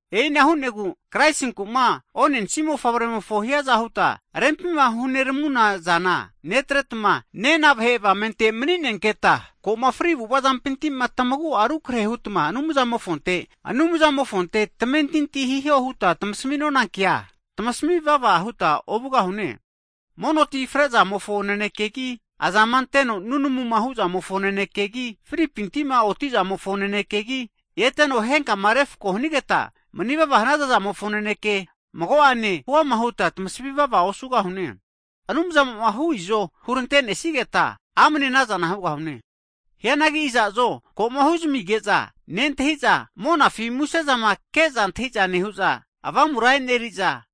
E'ina hu'negu Kraisinku'ma onensi mofavremofo hiaza huta rempima huneramuna zana netretma, nena vahe avamente mani'nenketa, ko'ma fri avu'avazampintima tamagu'a rukrehe hutma Anumzamofonte tmamentinti hiho huta tmasaminona kea, tamasami vava huta ovugahune. Mono tima frezamofo nanekegi, azama anteno nunamuma hu'zamofo nanekegi, fripinti'ma oti zamofo nanekegi, eteno henkama refko hanigeta manivava hanaza'zamofo naneke mago'ane huama huta tamasami vava osugahune. Anumzamo'ma hu izoma hurantenesigeta, amane anazana hugahune. Hianagi iza'zo koma huzamige'za nentahiza, monafi musezama ke'za antahiza nehu'za, Avamura e'neriza,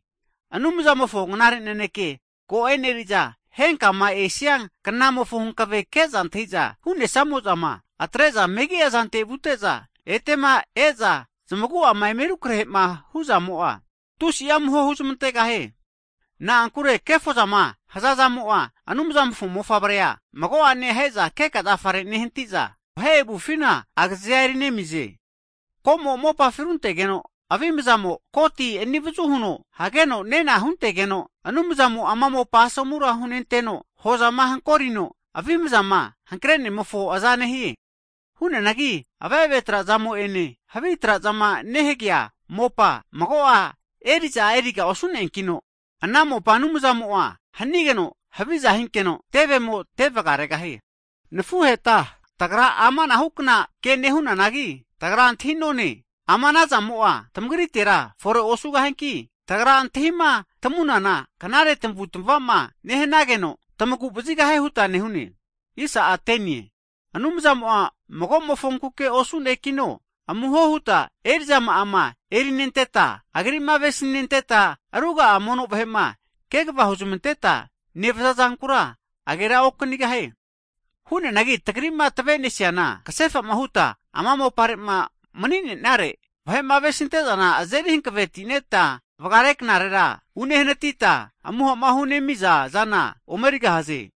Anumzamofo knare naneke ko eneriza, henkama esianknamofo hankave ke'za antahiza hu'nesamozama, atre'za megi'a zante vute'za, etema e'za zamagu'ama eme rukrahema hu'zamo'a, tusi'a amuho huzamantegahie. Na'ankure kefozama hazazamo'a, Anumzamofo Mofavrea mago'ane aheza keka zafare nehantiza, vahe avufina agazea eri nemize. Ko'mo'ma mopafi runtegeno, avimzamo koti anivazu huno hageno nena rga'a retegeno Anumzamo ana mopa asomura hunenteno, hozama hankorino avimazama hankrenemofo aza nehie. Hu'neanagi ave'ave trazamo'ene havi trazama nehagea mopa, magoa eri'za eriga osu'neankino, ana mopa Anumzamo hanigeno haviza hinkeno, tevemo tevgaregahie. Nafuheta tagra ama anahukna ke nehunanagi, tagra antahinone ama anazamo'a tamagritera fore osugahianki, tagra antahima tamunana knare tamavutmavama nehanageno, tamagu vazigahie huta nehune. Anumzamo'a mago'mofonkuke osu'ne'kino, amuho huta eri'zama'ama erinenteta Agri'ma avesinenteta ruga'a mono vahema kegva huzmanteta nevaza zankura agera okanigahie. Hianagi tagri'ma tavenesiana, kasefama huta ama mopare'ma mani'nenare vahe'ma avesintezana azeri hanavetineta vgare knarera unehanatita, amuhama hu'nemiza zana omerigahaze.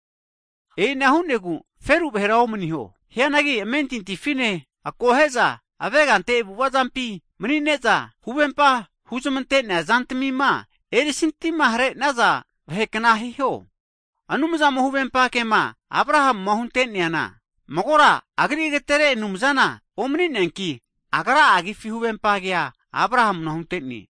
E'ina hu'negu feru vahera omaniho. Hianagi amentintifine akohe'za avegante avu'avazampi manine'za huvempa huzmante'nea zantamima erisintihare'naza vahekna hiho. Anumzamo huvempa kema Abrahama hunteneana, magora Agri agetere anumzana omani'neankino Agra'a Agifi huvempa kea Abrahana huntene.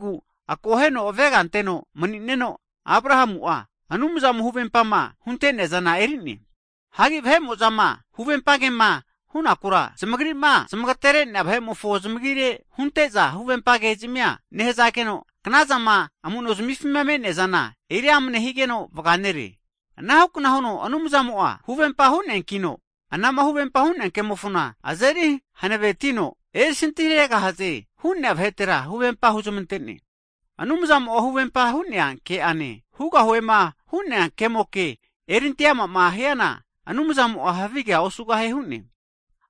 Hu'negu akoheno avega anteno mni'neno Abrahamu'a, Anumzamo huvempama hunte'neazana erine. Hagi vahe'mo'zama huvempa kema hunakura, zamagrima zamagaterenea vahe'mofo zmagire hunte'za huvempa kezamia nehazageno, knazama amu'nozmifima me'neazana eriama higeno vga nere. Anahukna huno Anumzamo'a huvempa hu'neakino, anama huvempa hu'nea kemofona azeri hanavetino, erisanti haregahaze hu'nea vahetera huvempa huzmantene. Anumzamo'a huvempa hu'nea ke'ane, hugahuema hu'nea kemoke eri'ante amama hiana, Anumzamo'a havigea osugahie hu'ne.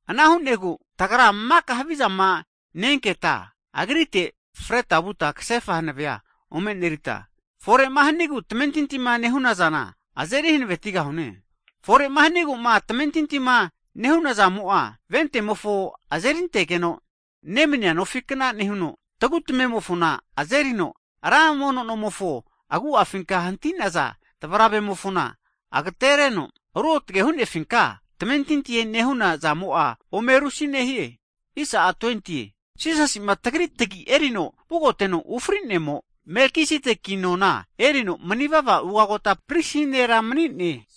Ana hu'negu tagra maka havizama ne-enketa, Agritega freta vuta kasefa hanavea ome enerita, fore'ma hanigu tamentintima nehu'naza azeri hanavetigahune. Fore hanigu'ma tamentintima nehunazamo'a, ventemofo azerintegeno nemania nofikna nehuno, tagutamemofona azerino ra mono nomofona agu'afinka hantinaza tavaravemofona' agatereno ruotge hu'nefinka tamentintima nehuna zamo'a ome rusi nehie. Jisasi'ma tagri tagi erino vugoteno ufrenemo, Melkisedeki nona erino mani'vava Ugota Prisi nera mani'ne.